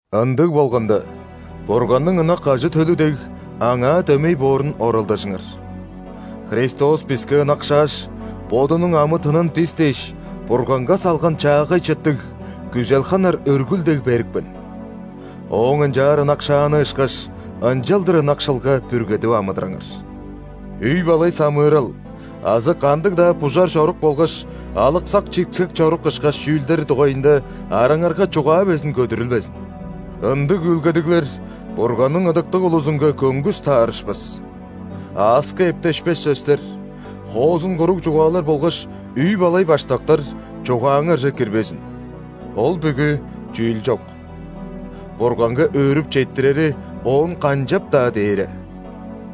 Ындыг болганда, Бурганның ынак ажы-төлү дег, Аңаа дөмей боорун оралдажыңар. Христос биске ынакшааш, Бодунуң амы-тынын бис дээш Бурганга салган чаагай чыттыг, күзел ханар өргүл дег берипкен. Ооң ынчаар ынакшааны ышкаш, ынчалдыр ынакшылга бүргедип амыдыраңар. Үй-балай самыырал азы кандыг-даа бужар чорук болгаш алыксак-чиксек чорук ышкаш чүүлдер дугайында араңарга чугаа безин көдүрүлбезин. Ындыг үүлгедиглер Бурганның ыдыктыг улузунга көңгүс таарышпас. Ааска эптешпес сөстер, хоозун куруг чугаалар болгаш үй-балай баштактар чугааңарже кирбезин, ол бүгү чүүл чок! Бурганга өөрүп четтирери оон канчап-даа дээре!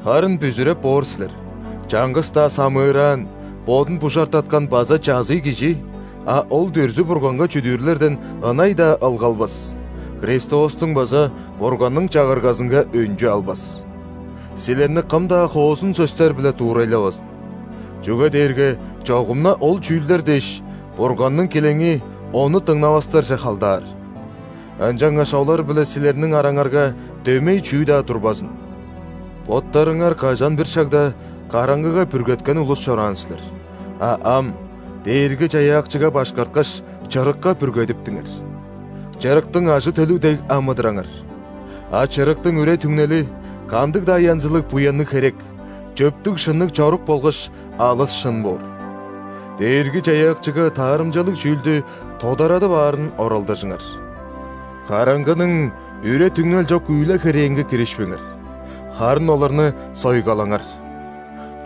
Харын бүзүреп боор силер: чаңгыс-даа самыыраан, бодун бужартаткан база чазый кижи (а ол дүрзү-бурганга чүдүүрлерден ынай-даа ылгалбас) Христостуң база Бурганның Чагыргазынга өнчү албас. Силерни кым-даа хоозун сөстер-биле дуурайлавазын! Чүге дээрге чогум-на ол чүүлдер дээш, Бурганның килеңи Ону дыңнавастарже халдаар. Ынчангаш олар-биле силерниң араңарга дөмей чүү-даа турбазын! Боттарыңар кажан-бир шагда караңгыга бүргеткен улус чораан силер, а ам, Дээрги-Чаяакчыга башкарткаш, чырыкка бүргедиптиңер. Чырыктың ажы-төлү дег амыдыраңар! А чырыктың үре-түңнели – кандыг-даа янзылыг буянныг херек, чөптүг-шынныг чорук болгаш алыс шын боор. Дээрги-Чаяакчыга таарымчалыг чүүлдү тодарадып аарын оралдажыңар. Караңгының үре-түңнел чок үүле-херээнге киришпеңер, харын оларны сойгалаңар.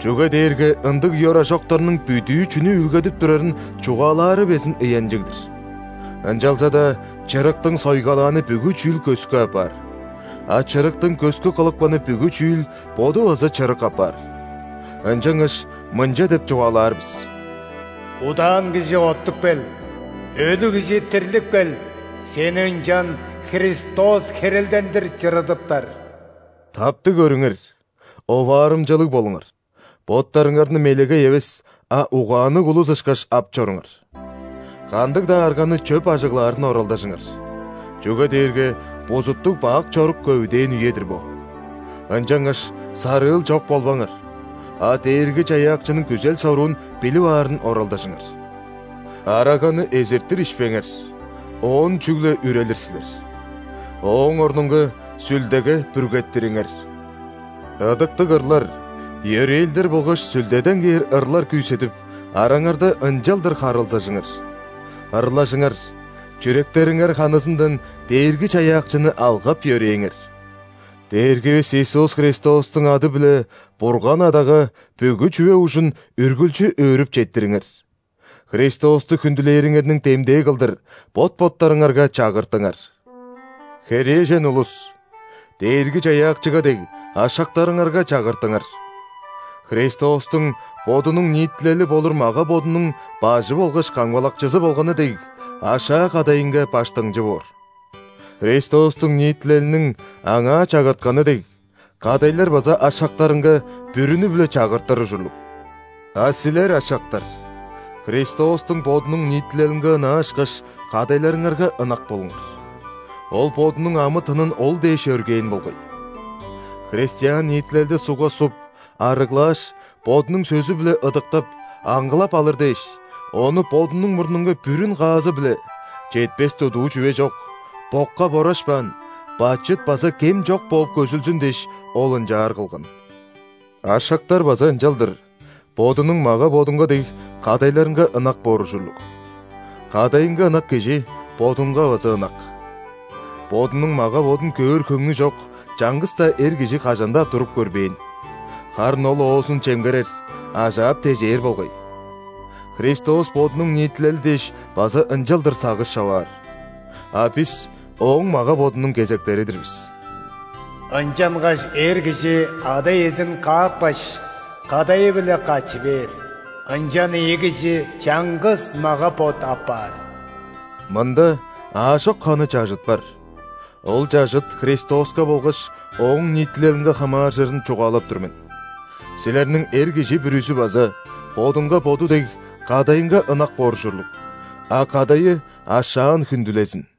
Чүге дээрге ындыг ёражоктарның бүдүү чүнү үүлгедип турарын чугаалаары безин ыянчыг-дыр. Ынчалза-даа чырыктың сойгалааны бүгү чүүл көскү апаар. А чырыктың көскү кылыпканы бүгү чүүл боду база чырык апаар. Ынчангаш мынча деп чугаалаар бис:«Удаан кижи, оттуп кел!Өлүг кижи, дирлип кел,сени ынчан Христос херелдендир чырыдыптар!» Таптыг көрүңер, оваарымчалыг болуңар: боттарыңарны мелегей эвес, а угаанныг улус ышкаш ап чоруңар. Кандыг-даа арганы чөп ажыглаарын оралдажыңар, чүге дээрге бузуттуг-бак чорук көвүдээн үе-дир бо. Ынчангаш сарыыл чок болбаңар, а Дээрги-Чаяакчының күзел-соруун билип аарын оралдажыңар. Араганы эзиртир ишпеңер, оон чүгле үрелир силер. Ооң орнунга Сүлдеге бүргеттириңер. Ыдыктыг ырлар, йөрээлдер болгаш Сүлдеден кээр ырлар күүседип, араңарда ынчалдыр харылзажыңар. Ырлажыңар, чүректериңер ханызындан Дээрги-Чаяакчыны алгап-йөрээңер. Дээргивис Иисус Христостуң ады-биле Бурган Адага бүгү чүве ужун үргүлчү өөрүп четтириңер. Христосту хүндүлээриңерниң демдээ кылдыр бот-боттарыңарга чагыртыңар. Херээжен улус, Дээрги-Чаяакчыга дег, ашактарыңарга чагыртыңар. Христостуң Бодунуң ниитилели болур мага-бодунуң Бажы болгаш Камгалакчызы болганы дег, ашаа кадайынга баштыңчы боор. Христостуң ниитилелиниң Анаа чагыртканы дег, кадайлар база ашактарынга бүрүнү-биле чагыртыр ужурлуг. А силер, ашактар, Христостуң Бодунуң ниитилелинге ынаа ышкаш, кадайларыңарга ынак болуңар. Ол Бодунуң амы-тынын ол дээш өргээн болгай. Христиан ниитилелди ·сугга чуп, арыглааш, Бодунуң сөзү-биле ыдыктап, аңгылап алыр дээш, ону Бодунуң мурнунга бүрүн каазы-биле: четпес-дудуу чүве чок, бокка борашпаан – бачыт база кем чок бооп көзүлзүн дээш, Ол ынчаар кылган. Ашактар база ынчалдыр, бодунуң мага-бодунга дег, кадайларынга ынак боор ужурлуг. Кадайынга ынак кижи бодунга база ынак. Бодунуң мага-бодун көөр хөңнү чок чаңгыс-даа эр кижи кажан-даа туруп көрбээн, харын ол оозун чемгерер, ажаап-тежээр болгай. Христос Бодунуң ниитилели дээш база ынчалдыр сагыш човаар. А бис Ооң мага-бодунуң кезектери-дир бис. Ынчангаш эр кижи ада-иезин каапкаш, кадайы-биле катчы бээр,ынчан ийи кижи чаңгыс мага-бот апаар. Мында аажок ханы чажыт бар, ол чажыт Христоска болгаш Ооң ниитилелинге хамааржырын чугаалап тур мен. Силерниң эр кижи бүрүзү база, бодунга боду дег, кадайынга ынак боор ужурлуг, а кадайы ашаан хүндүлезин.